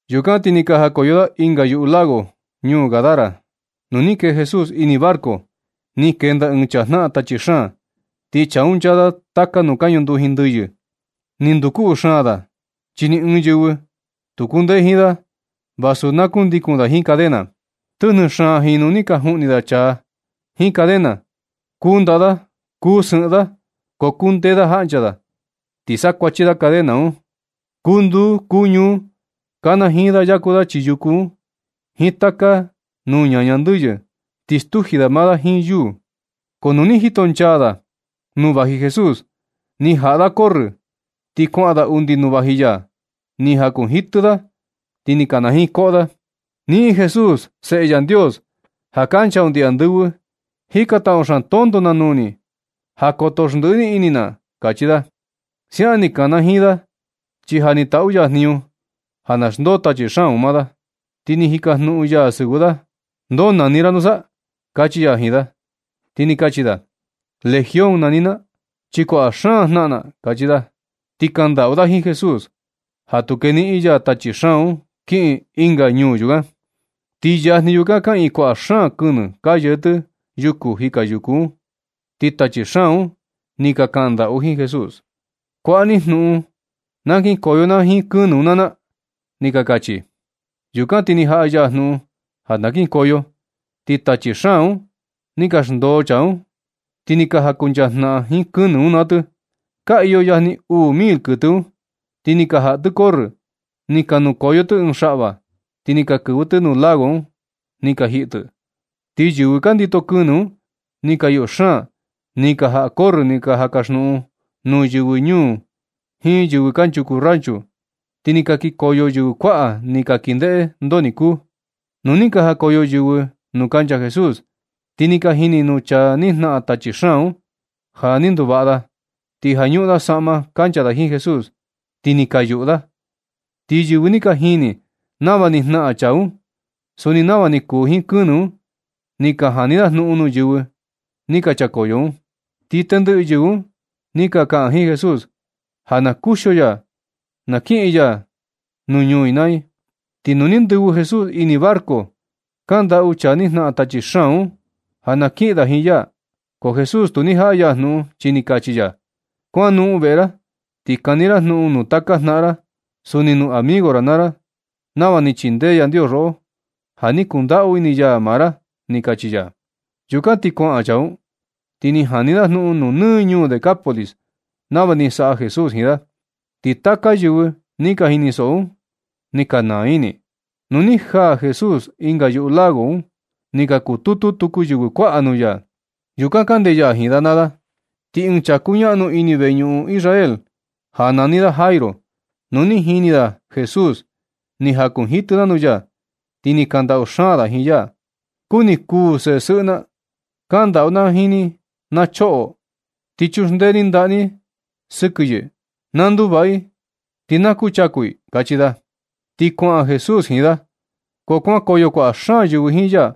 Yukan ti ni ka jakoyo da ɨnga yuꞌu lago, ñuu Gadara. Nu ni kee Jesús ini barco, ni kenda ɨɨn chaa jnaꞌan tachi xaan. Ti chaa un nchaa da taka nuu ka ñunduji ndɨyɨ. Ni nduu loco xaan da, chi ni ɨɨn yɨvɨ tu kundee jiin da vasu na kundikun da jiin cadena. Tɨjnɨ xaan jinu ni ka juꞌni da chaa un jiin cadena, kuu ndaꞌa da kuu sɨꞌɨn da, ko kundee da jaꞌncha da, ti sakuachi da cadena un. Kuu nduu kuu ñuu kanajiin da yaku da chii yuku un jiin taka nuu ñaña ndɨyɨ, ti stuji da maa da jiin yuu. Ko nu ni jito nchaa jika da ja vaji Jesús, ni jaꞌa da corrɨ, ti kuaꞌan da undi nuu vaji ya. Ni jakunjitɨ da, ti ni kanajiin koꞌo da: ―Niꞌin Jesús, Seꞌe Yandios ja kancha undi andɨvɨ, jikantaꞌu xaan tonto na nuu ni ja koto xndɨꞌɨ ni ini na ―kachi da. Siaꞌan ni kanajiin da, chi ja ni taꞌu ya jniñu ja na xndoo tachi xaan un maa da. Ti ni jikajnuꞌun ya sɨvɨ da: ―¿Ndoo nani ra nusa? ―kachi ya jiin da. Ti ni kachi da: ―Legión nani na, chi kuaꞌa xaan jnaꞌan na ―kachi da. Ti kandaꞌu da jiin Jesús ja tu keniꞌin ya tachi xaan un kiꞌin ɨnga ñuu yukan. Ti yajni yukan kaꞌiin kuaꞌa xaan kɨnɨ ka yee tɨ yuku jika yuku un. Ti tachi xaan un ni ka kandaꞌu jiin Jesús: ―Kuaꞌa ni jnuꞌun na kinkoyo na jiin kɨnɨ un naa na ―ni ka kachi. Yukan ti ni jaꞌa ya jnuꞌun ja na kinkoyo. Ti tachi xaan un ni xndoo chaa un ti ni ka jankuncha jnaꞌan jiin kɨnɨ un naa tɨ. Ka iyo yajni uu mil kɨtɨ un. Ti ni ka jaꞌa tɨ corrɨ ni ka nukoyo tɨ ɨɨn xaꞌva, ti ni ka kɨvɨ tɨ nuu lago un ni ka jiꞌi tɨ. Ti yɨvɨ ka ndito kɨnɨ un, ni ka yuꞌu xaan. Ni ka jaꞌa corrɨ ni ka kaxnuꞌun nuu yɨvɨ ñuu jiin yɨvɨ kanchuku ranchu. Ti ni ka kikoyo yɨvɨ kuaꞌa ni ka kin ndeꞌe ndoo ni kuu. Nu ni ka jakoyo yɨvɨ nuu kancha Jesús, ti ni ka jini nuu chaa ni jnaꞌan tachi xaan un, ja ni nduvaꞌa da. Ti ja ñuꞌun da saꞌma kancha da jiin Jesús, ti ni ka yuꞌu da. Ti yɨvɨ ni ka jini nava ni jnaꞌan chaa un. Suni nava ni kuu jiin kɨnɨ un, ni ka jani da jnuꞌun nuu yɨvɨ ni ka chakoyo un. Ti tendɨꞌɨ yɨvɨ un ni ka kaꞌan jiin Jesús ja na kuxio ya na kiꞌin ya ñuu i naa i. Ti nu ni ndɨvɨ Jesús ini barco, kandaꞌu chaa ni jnaꞌan tachi xaan un ja na kiꞌin da jiin ya. Ko Jesús tu ni jaꞌa ya jnuꞌun, chi ni kachi ya: ―Kuanoꞌon veꞌe ra ti kani ra jnuꞌun nuu taka jnaꞌan ra, suni nuu amigo ra, nava ni chindee Yandios roꞌo ja ni kundaꞌu ini ya maa ra ―ni kachi ya. Yukan ti kuaꞌan chaa un, ti ni jani da jnuꞌun nɨ ñuu Decápolis nava ni saꞌa Jesús jiin da. Ti taka yɨvɨ ni ka jinisoꞌo un, ni ka naa ini i. Nu ni najaa Jesús ɨnga yuꞌu lago un, ni ka kututu tuku yɨvɨ kuaꞌa nuu ya. Yukan kande ya jiin da naa da. Ti ɨɨn chaa kuñaꞌnu ini ɨɨn veñuꞌun Israel ja nani da Jairo, nu ni jini da Jesús, ni jakunjitɨ da nuu ya. Ti ni kandaꞌu xaan da jiin ya: ―Kuni kuu seꞌe sɨꞌɨ na. Kaꞌan ndaꞌu na jiin favor na choꞌo, ti chuxndee ni ndaꞌa ni sɨkɨ yɨ, na nduvaꞌa i ti na kuchaku i ―kachi da. Ti kuaꞌan Jesús jiin da. Ko kuankoyo kuaꞌa xaan yɨvɨ jiin ya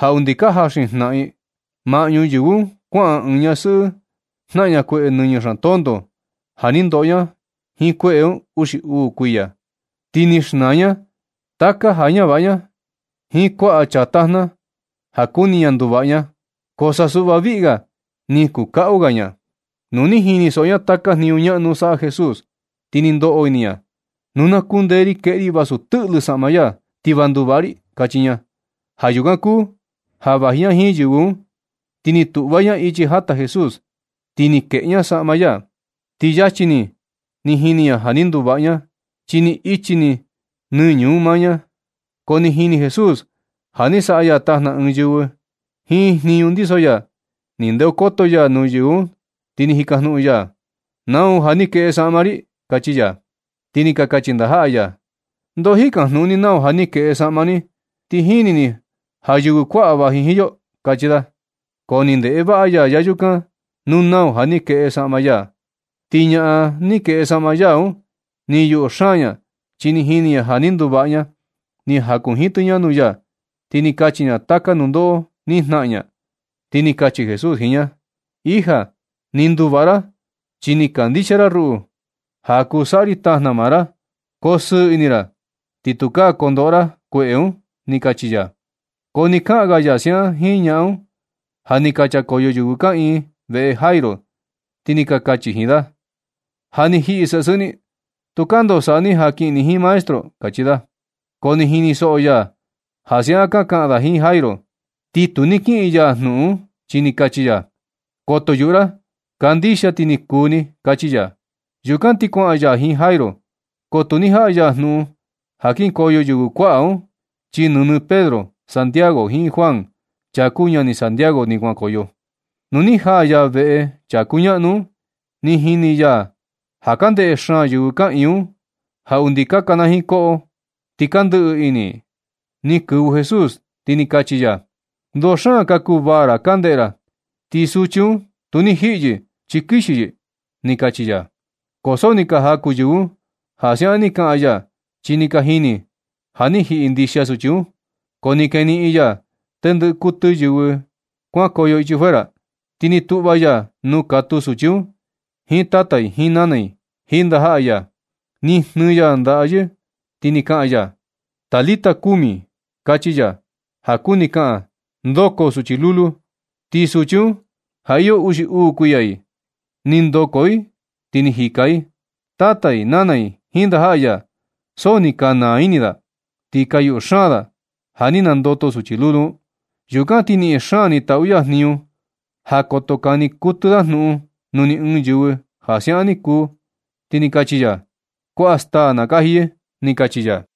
ja undi ka jaxin jnaꞌan i. Maꞌñu yɨvɨ un kuaꞌan ɨɨn ñasɨꞌɨ jnaꞌan kueꞌe nɨñɨ xaan tonto ja ni ndoꞌo ña jiin kueꞌe un uxi uu kuiya. Ti ni xnaa ña taka ja ñavaꞌa ña jiin kuaꞌa chaa tajna ja kuni ña nduvaꞌa ña, ko sa suꞌva viꞌga ni kuu kaꞌu ga ña. Nu ni jinisoꞌo ña taka jniñu ñaꞌnu saꞌa Jesús, ti ni ndoꞌo ini ña: ―Nu na kundee ri kueꞌe ri vasu tɨꞌlɨ saꞌma ya ti va nduvaꞌa ri ―kachi ña. Ja yukan kuu ja vaji ña jiin yɨvɨ un, ni tuꞌva ña ichi jata Jesús, ti ni keꞌe ña saꞌma ya. Ti yachi ni ni jini ña ja ni nduvaꞌa ña, chi ni ichi ni nɨñɨ un maa ña. Ko ni jini Jesús ja ni saꞌa ya tajna ɨɨn yɨvɨ jiin jniñu ndiso ya. Ni ndeokoto ya nuu yɨvɨ un ti ni jikajnuꞌun ya: ―¿Nau ja ni keꞌe saꞌma ri? ―kachi ya. Ti ni ka kachi ndajaꞌa ya: ―¿Ndoo jikajnuꞌun ni nau ja ni keꞌe saꞌma ni, ti jini ni ja yɨvɨ kuaꞌa vaji jiin yo? ―kachi da. Ko ni ndeꞌe vaꞌa ya yayukan nuu nau ja ni keꞌe saꞌma ya. Ti ñaꞌan ni keꞌe saꞌma ya un, ni yuꞌu xaan ña chi jini ña ja ni nduvaꞌa ña. Ni jakunjitɨ ña nuu ya ti ni kachi ña taka nundoꞌo ni jnaꞌan ña. Ti ni kachi Jesús jiin ña: ―Hija, ni nudvaꞌa ra chi ni kandixia ra ruꞌu, ja kuu saꞌa ri tajna maa ra. Koo sɨɨ ini, ti tukaa kondoꞌo ra kueꞌe un ―ni kachi ya. Ko ni kaꞌan ga ya siaꞌan jiin ñaꞌan un, ja ni ka chakoyo yɨvɨ kaꞌiin veꞌe Jairo, ti ni kachi jiin da: ―Ja ni jiꞌi sesɨꞌɨ ni. Tukaa ndoo saꞌa ni ja kiꞌin ni jiin maestro ―kachi da. Ko ni jinisoꞌo ya ja siaꞌan ka kaꞌan da jiin Jairo. Ti tu ni kiꞌin ya jnuꞌun un, chi ni kachi ya: ―Koto yuꞌu ra. Kandixia ti ni kuu ni ―kachi ya. Yukan ti kuaꞌan ya jiin Jairo, ko tu ni jaꞌa ya jnuꞌun ja kinkoyo yɨvɨ kuaꞌa un, chi nɨnɨ Pedro, Santiago jiin Juan, chaa kuu ñani Santiago ni kuankoyo. Nu ni jaa ya veꞌe chaa kuñaꞌnu un ni jini ya ja ka ndeꞌe xaan yɨvɨ kaꞌiin un, ja undi ka kanajiin koꞌo i ti ka ndɨꞌɨ ini i. Ni kɨvɨ Jesús ti ni kachi ya: ―Ndoo xaan ka kuvaa ra ka ndeꞌe ra ti suchi un tu ni jiꞌi yɨ, chi kixi yɨ ―ni kachi ya. Ko so ni ka jaku yɨvɨ un ja siaꞌan ni kaꞌan ya, chi ni ka jini ja ni jiꞌi ndixia suchi un. Ko ni keniꞌin ya tendɨꞌɨ kɨtɨ yɨvɨ un kuankoyo ichi fuera. Ti ni tuꞌva ya nuu katuu suchi un jiin tata i jiin nana i jiin ndajaꞌa ya. Ni jnɨɨ ya ndaꞌa yɨ ti ni kaꞌan ya: ―Talita kumi, (kachi ya, ja kuni kaꞌan: ndoko, suchi lulu.) Ti suchi un ja iyo uxi uu kuiya i, ni ndoko i ti ni jika i. Tata i, nana i jiin ndajaꞌa ya, so ni ka naa ini da, ti ka yuꞌu xaan da ja ni nandoto suchi lulu un. Yukan ti niꞌin xaan ni taꞌu ya jniñu ja koto kani kɨtɨ da jnuꞌun nuu ni ɨɨn yɨvɨ ja siaꞌan ni kuu. Ti ni kachi ya: ―Kuaꞌa staa na kaji yɨ ―ni kachi ya.